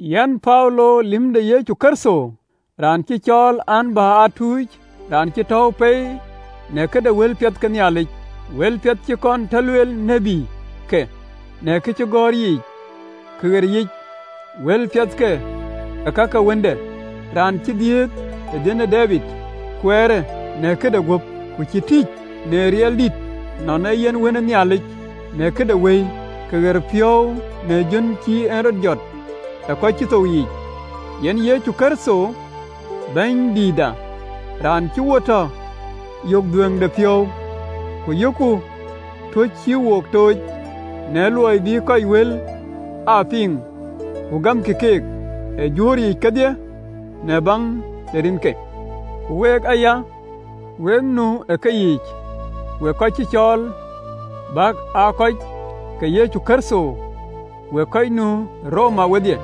Yɛn Paulo, lïm de Yecu Kërtho, raan cï cɔɔl, an, bï aa tuc, raan cï tɔ̈ɔ̈u pei në këde wëlpiɛth ke Nhialic. Wëlpiɛth cï kɔn tɔ lueel ë tïtke në kacïgɔ̈ɔ̈r yiic ka ɣeriic. Wëlpiɛthkë ee ka ke Wënde, raan cï dhiëëth ë dhiën ë Debid kuɛɛrë në këde guöp, ku cï tïc në riɛl dït nɔn ee yen Wën ë Nhialic, në këde Wëi ke ɣɛɛrëpiɔ̈u, në jön cï en rɔt jɔt ë kɔc cï thou yiic, yen Yecu Kërtho Bɛ̈nydïïtda, raan cï wo tɔ yök dhuëëŋdepiɔ̈u, ku yökku tuöc cï wo tooc, në luɔi bï kɔc wël aa piŋ ku gamkï keek ë juöör yiic kedhie, në baŋ de rinke. Ku week aya, wek nu ë keyiic, wek kɔc cï cɔɔl, bäk aa kɔc ke Yecu Kërtho. Wek kɔc nu Roma wedhie,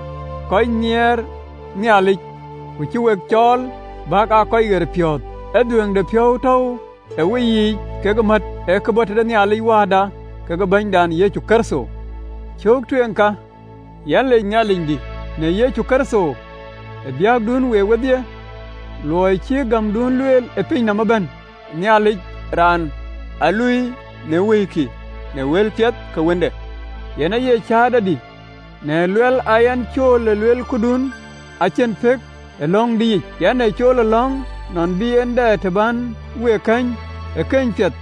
kɔc nhiɛɛr Nhialic, ku cï we cɔɔl, bäk aa kɔc ɣerpiɔ̈ɔ̈th. Ë dhuëëŋdepiɔ̈u tɔ̈u ë weyiic kekë mät, ë ke bɔ̈ tëde Nhialic Wääda kekë Bɛ̈nydït Yecu Kërtho. Cöök tueŋ ka, yɛn lec Nhialicdï në Yecu Kërtho ë biäkdun week wedhie, luɔi cï gämdun lueel ë piny nɔm ëbɛ̈n. Nhialic, Raan aa luööi në wëikï në wëlpiɛth ke Wënde, yen aye cäätɔdï, në luɛl aa yɛn cool ë luel këdun acïn pëk ë lɔ̈ŋdïyic, yɛn ee cool ë lɔ̈ŋ, nɔn bï en dɛ të bän week kɛ̈ny ë keny piɛth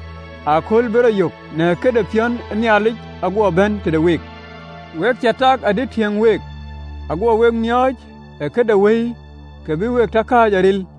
ëkööl bï rɔt yök në këde piɔ̈n ë Nhialic, aguɔ bɛ̈n tëde week. We cä tak adï tiëŋ week, aguɔ we miɔɔc ë kë de wëi, kë bï we tɔ kääc aril.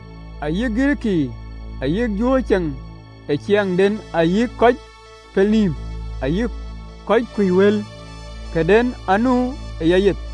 Ayï Girikii ayï juöör cëŋ ë ciɛɛŋden, ayï kɔc pelnïïm, ayï kɔc kuc wël, këden anu ë yayeth.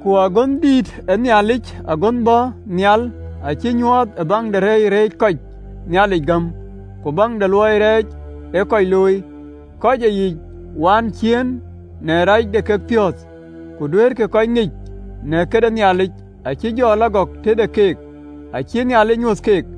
Ku agönhdïït ë Nhialic agönh bɔ̈ nhial acï nyuɔɔth ë baŋ de reec reecë kɔc Nhialic gam ku baŋ de luɔi rɛɛc ee kɔc looi, kɔc ë yic waan ciëën në rac de kekpiɔ̈ɔ̈th. Kë duëërë kɔc ŋic në këde Nhialic acï jɔ lɔ gɔk tëde keek, acïï Nhialic nyuöth keek.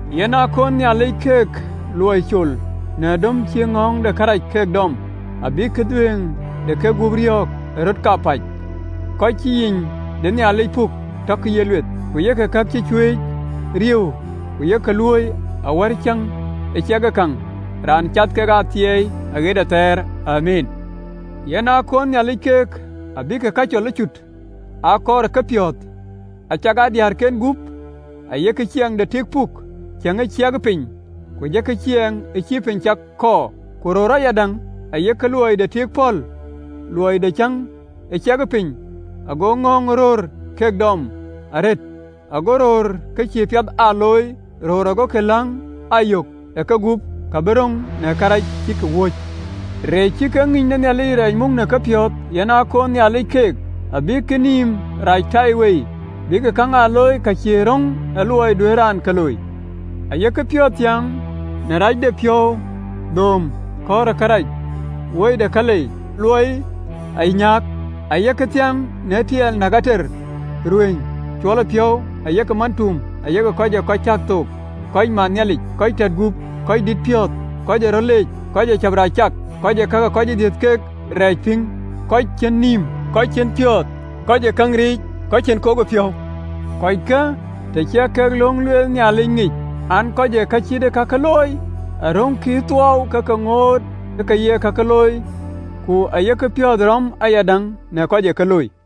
Yen aa kunë Nhialic keek luɔi col në döm cï ŋɔ̈ɔ̈ŋ de kërac ke dɔm, abïk dhuëëŋ de kegup riɔ̈ɔ̈k ë röt kapäc. Kɔc cï yic de Nhialic puk tɔkï ye lueth, ku yek kë cï cuëëc riëëu ku yek luööi, awär Aciëŋ ë cak käŋ, Raan cath ke athiɛɛi aɣet athɛɛr. Amiin. Yen aa koonë Nhialic keek abïk kacol ëcut aa kɔɔr ë kepiɔ̈ɔ̈th, acakaa diëërken gup ayek ciɛɛŋ de tik puk, ciɛɛŋ ë ciɛkë piny, ku jɔkï ciɛɛŋ ë piny cak kɔɔr. Ku röör ayadäŋ, ayek luɔi de tik pɔ̈l, luɔi de ciɛɛŋ ë ciɛkë piny, ago ŋɔ̈ɔ̈ŋ de röör ke dɔm arëët, ago röör kë cïï piɛth aa luöi röör, agokï käŋ aa yök ë kegup ka bï röŋ në awäny cïk wööc. Reec cï kek ŋïny de Nhialic rɛɛc muk ë kepiɔ̈ɔ̈th, yen aa koonë Nhialic keek, abïk nïïm rac ëtaiwei, bïk käŋ aa looi ka cïï röŋ ë luɔi duëër raan ke looi. Ayek piɔ̈ɔ̈th thiäŋ në racdepiɔ̈u, dhööm, kɔ̈ɔ̈r ë kërac, wui de kalei, luɔi de anyääk, ayek thiäŋ në tiɛɛl, näk, ater, ruëëny, cuɔlëpiɔ̈u, ayek mantuum, ayek kɔc ë kɔc cäk thook, kɔc man Nhialic, kɔc tät gup, röördït piɔ̈ɔ̈th, kɔc ee röt leec, kɔc ee cäp rac cak, kɔc ee ka ke kɔc ë dhiëth keek rɛɛc piŋ, kɔc cïn nïïm, kɔc cïn piɔ̈ɔ̈th, kɔc ee käŋ riic, kɔc cïn kokdepiɔ̈u. Kɔckë, të ciɛk kek löŋ ë lueel Nhialic ŋic an, kɔc ë ka cït ee kake looi aröŋkï ë thuɔɔu, ke ke ŋoot ë ke ye kakë looi, ku yek piɔ̈ɔ̈th rɔ̈m ayadäŋ në kɔc ë ke looi.